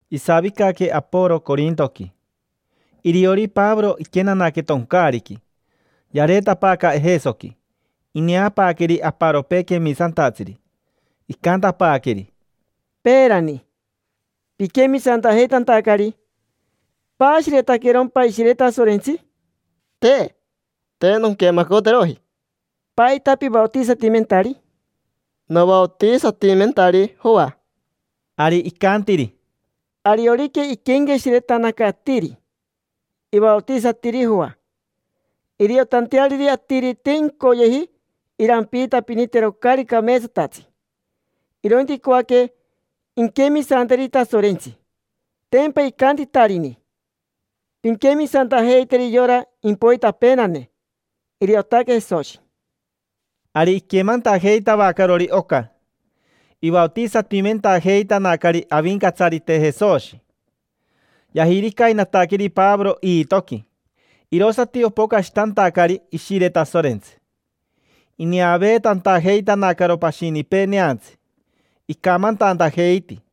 Isavicaque Aporo Corintoqui, iriori Pavoro iquenanaque toncaariqui, yareetapaaca Ejesoqui. Ineapaaqueri aparopee quemisantatsiri. Icantapaaqueri: —Peerani, piquemisantajeitantacari, ¿paashiretaquerompa Ishire Tasorentsi? —Te. Te nonquemacoteroji. —¿Paita pivaotisatimentari? —Novaotisatimentari Joa. Ari icantiri: —Ariorica iquenqueshiretanaca atiri, ivaotisatiri Joa iriotanteariri atiri te incoyeji irampiitapinitero caari cameetsatatsi, irointi icoaque inquemisanteri Tasorentsi. Tempa icantitarini: “Pinquemisantajeiteri yora impoitapeenane, iriotaque Jesoshi”. Ari iquemantajeitavacarori oca, ivaotisatimentajeitanacari Avincatsarite Jesoshi. Yajiricainataqueri Pavoro iitoqui, irosati opocashitantacari Ishire Tasorentsi, ineaveetantajeitanacaro pashinipee neantsi, icamantantajeiti.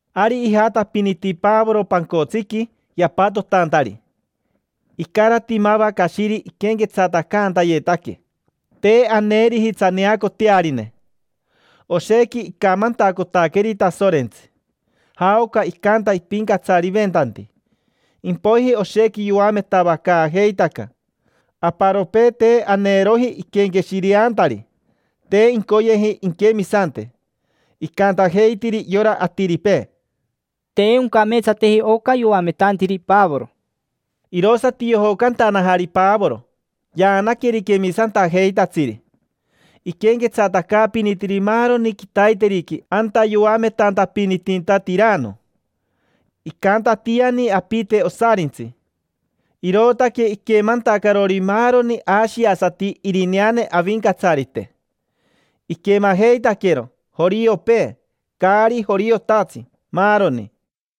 Ari ijatapiniti Pavoro pancotsiqui yapatotantari, icarati mava cashiri iquenquetsatacantayetaque. Te aneeriji tsaneacotearine. Oshequi icamantacotaqueri Tasorentsi, jaoca icanta ipincatsariventanti. Impoiji oshequi yoametavacaajeitaca. Aparopee, te aneeroji iquenqueshireantari, te incoyeji inquemisante. Icantajeitiri yora atiripee: —Te oncameetsateji oca yoametantiri Pavoro. Irosati yojocantanajari Pavoro, yaanaqueri quemisantajeitatsiri. Iquenquetsatacaapinitiri maaroni quitaiteriqui anta yoametantapinitinta Tirano. Icantatiani apite osarintsi, irootaque iquemantacarori maaroni ashiasati irineane Avincatsarite. Iquemajeitaquero: joriopee, caari joriotatsi, maaroni.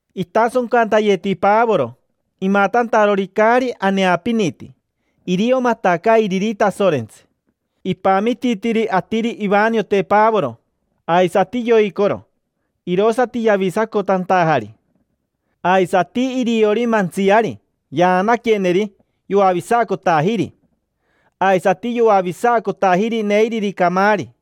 Itasoncantayeti Pavoro, imatantarori caari aneapiniti. Irio matacairiri Tasorentsi. Ipamititiri atiri ivaniote Pavoro, aisati yoicoro, irosati yavisacotantajari. Aisati iriori mantsiari, yaanaqueneri, yoavisacotajiri. Aisati yoavisacotajiri neiriri camaari.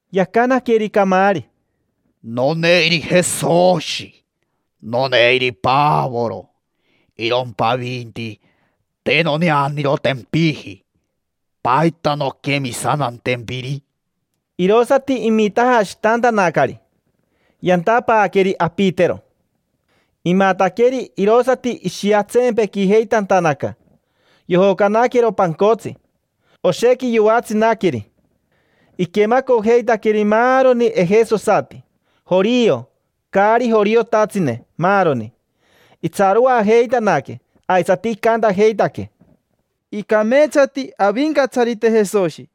Yacanaqueri camaari: —Noneiri Jesoshi. Noneiri Pavoro. Irompa avinti, te noneanirotempiji. ¿Paita nonquemisantantempiri? Irosati imitajashitantanacari, mita; yantapaaqueri apitero. Imataqueri, irosati ishiatsempequijeitantanaca, yojocanaquero pancotsi. Oshequi yoatsinaqueri. Iquemacojeitaqueri maaroni ejesosati: jorio, caari joriotatsine, maaroni. Itsaroajeitanaque aisati icantajeitaque: —Icameetsati Avincatsarite Jesoshi: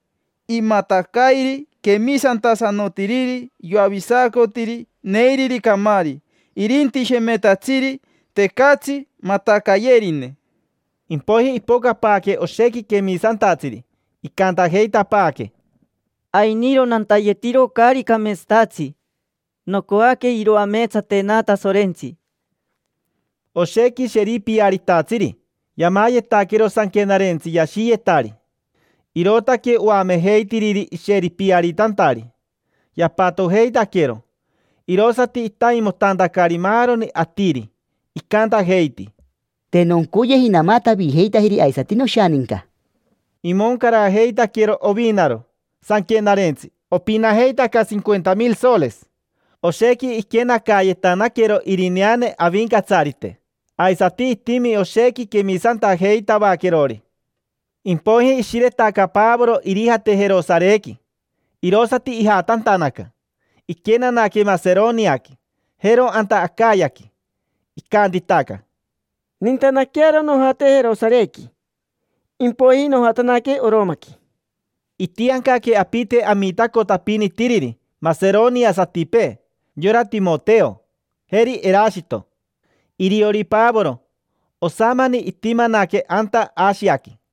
imatacairi quemisantasanotiriri yoavisacotiri neiriri camaari. Irinti shemetatsiri, tecatsi matacayerine. Impoiji ipocapaaque oshequi quemisantatsiri, icantajeitapaaque: —Ainiro nantayetiro caari cameetsatatsi, nocoaque iroameetsatena Tasorentsi. Oshequi sheripiaritatsiri yamayetaquero sanquenarentsi yashiyetari: irootaque oamejeitiriri isheripiaritantari. Yapatojeitaquero, irosati itaimotantacari maaroni atiri. Icantajeiti: —Te noncoyeji namatavijeitajeri aisati noshaninca. Imoncarajeitaquero ovinaro sanquenarentsi, opinajeitaca S/.50,000. Oshequi iquenacayetanaquero irineane Avincatsarite, aisati itimi oshequi quemisantajeitavaquerori. Impoiji ishiretaca Pavoro irijate Jerosarequi, irosati ijatantanaca. Iquenanaque Maseroniaqui, jero anta Acayaqui. Icantitaca: —Nintanaquearo nojate Jerosarequi, impoiji nojatanaque Oromaqui. Itiancaque apite amitacotapinitiriri maseroniasatipee: yora Timoteo, jeri Erashito. Iriori Pavoro, osamani itimanaque anta Ashiaqui.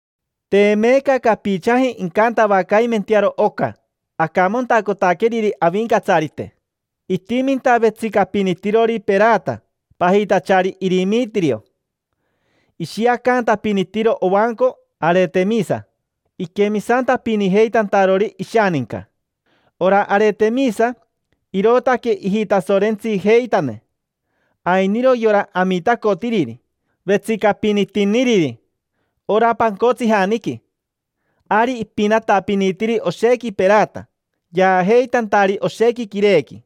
Te meeca capichaji incantavacaimentearo oca acamantacotaqueriri Avincatsarite. Itiminta vetsicapinitirori perata pajitachari Irimitirio. Ishiacantapinitiro ovanco Aretemisa iquemisantapinijeitantarori ishaninca. Ora Aretemisa irootaque ijitasorentsijeitane. Ainiro yora amitacotiriri, vetsicapinitiniriri ora pancotsijaniqui; ari ipinatapinitiri oshequi perata, yaajeitantari oshequi quirequi.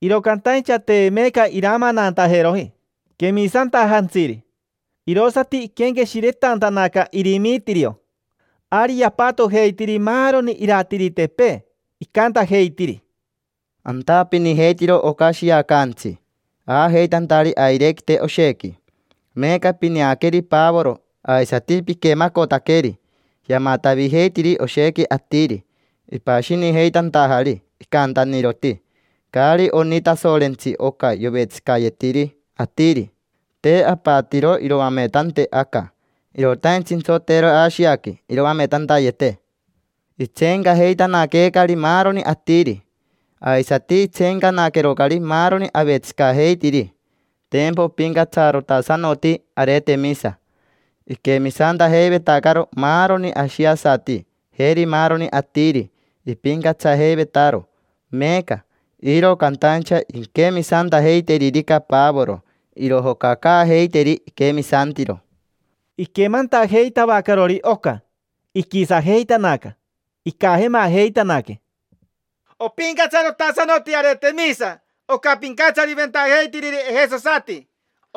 Iro cantaincha te meeca iramanantajeroji quemisantajantsiri, irosati iquenqueshiretantanaca Irimitirio. Ari yapatojeitiri maaroni iratiritepee, icantajeitiri: —Antapinijeitiro oca shiacaantsi aajeitantari airequite oshequi. Meeca pineaqueri Pavoro, aisati piquemacotaqueri: yamatavijeitiri oshequi atiri, ipashinijeitantajari. Icantaniroti: “Caari oni Tasorentsi oca yovetsicayetiri atiri”. Te apatiro iroametante aca: irotaintsi intsoteero Ashiaqui iroametantayete. Itseencajeitanaqueecari maaroni atiri, aisati itseencanaquerocari maaroni avetsicajeitiri. Tempa opincatsarotasanoti Aretemisa: iquemisantajeivetacaro maaroni ashiasati, jeri maaroni atiri. Ipincatsajeivetaro meeca, iro cantaincha inquemisantajeiteririca Pavoro, irojocacaajeiteri iquemisantiro. Iquemantajeitavacarori oca, iquisajeitanaca. Icajemajeitanaque: —Opincatsarotasanoti Aretemisa, oca pincatsariventajeitiriri ejesosati.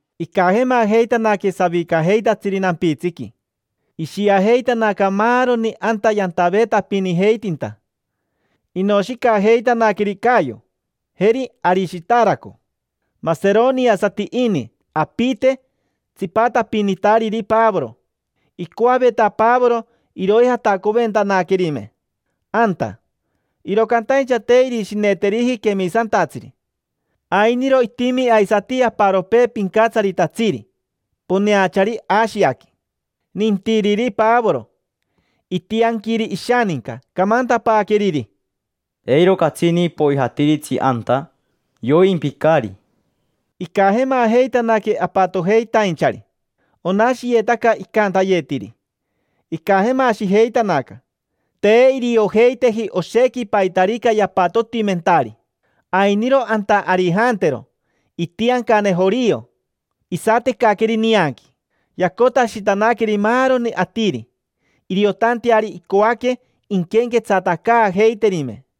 Icajemajeitanaque savicajeitatsiri nampitsiqui. Ishiajeitanaca maaroni anta yantaveetapinijeitinta. Inoshicajeitanaqueri Cayo, jeri Arishitaraco, sorororo. Maseroniasati ini apite, tsipatapinitariri Pavoro. Icoaveta Pavoro iroijatacoventanaquerime anta, iro cantaincha te irishineteriji quemisantatsiri. Ainiro itimi aisati aparopee pincatsaritatsiri, poneachari Ashiaqui, nintiriri Pavoro. Itianquiri ishaninca, camantapaaqueriri: —Eiro catsini poijatiritsi anta: yoimpicari. Icajemajeitanaque apatojeitainchari, onashiyetaca icantayetiri. Icajemashijeitanaca. Te iriojeiteji oshequi paitarica yapatotimentari. Ainiro anta Arijantero, itiancane jorio, isatecaqueri nianqui. Yacotashitanaqueri maaroni atiri, iriotanteari icoaque inquenquetsatacaajeiterime.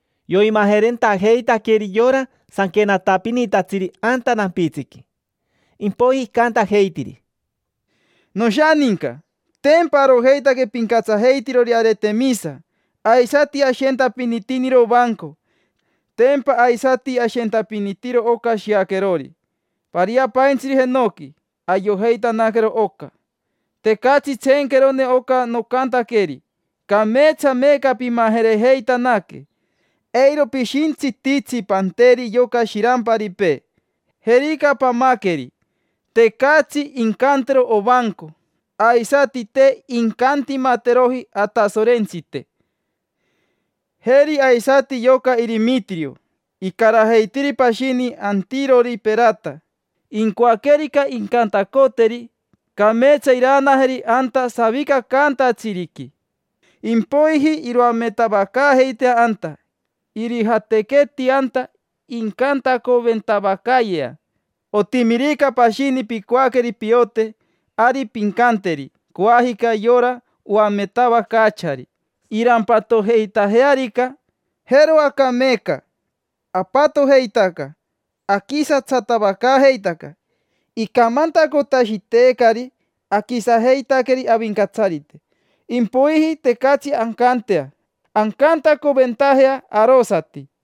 Yoimajerentajeitaqueri yora sanquenatapinitatsiri anta nampitsiqui. Impoiji icantajeitiri: —Noshaninca. Tempa arojeitaque pincatsajeitirori Aretemisa, aisati ashentapinitiniro ovanco. Tempa aisati ashentapinitiro oca shiaquerori, pariapaintsiri jenoqui. Ayojeitanaquero oca, tecatsi tseenquerone oca nocantaqueri. Cameetsa meeca pimajerejeitanaque. Eiro pishintsititsi panteri yoca shiramparipee. Jerica pamaqueri, tecatsi incantero ovanco, aisati te incantimateroji atasorentsite. Jeri aisati yoca Irimitirio, icarajeitiri pashini antirori perata. Incoaquerica incantacoteri, cameetsa iraanajeri anta savicacaantatsiriqui, impoiji iroametavacaajeitea anta. Irijatequeti anta incantacoventavacayea. Otimirica pashini picoaqueri piote, ari pincanteri coajica yora oametavacaachari, irampatojeitajearica. Jero aca meeca apatojeitaca, aquisatsatavacaajeitaca. Icamantacotashiteecari aquisajeitaqueri avincatsarite, impoiji tecatsi ancantea ancantacoventajea arosati.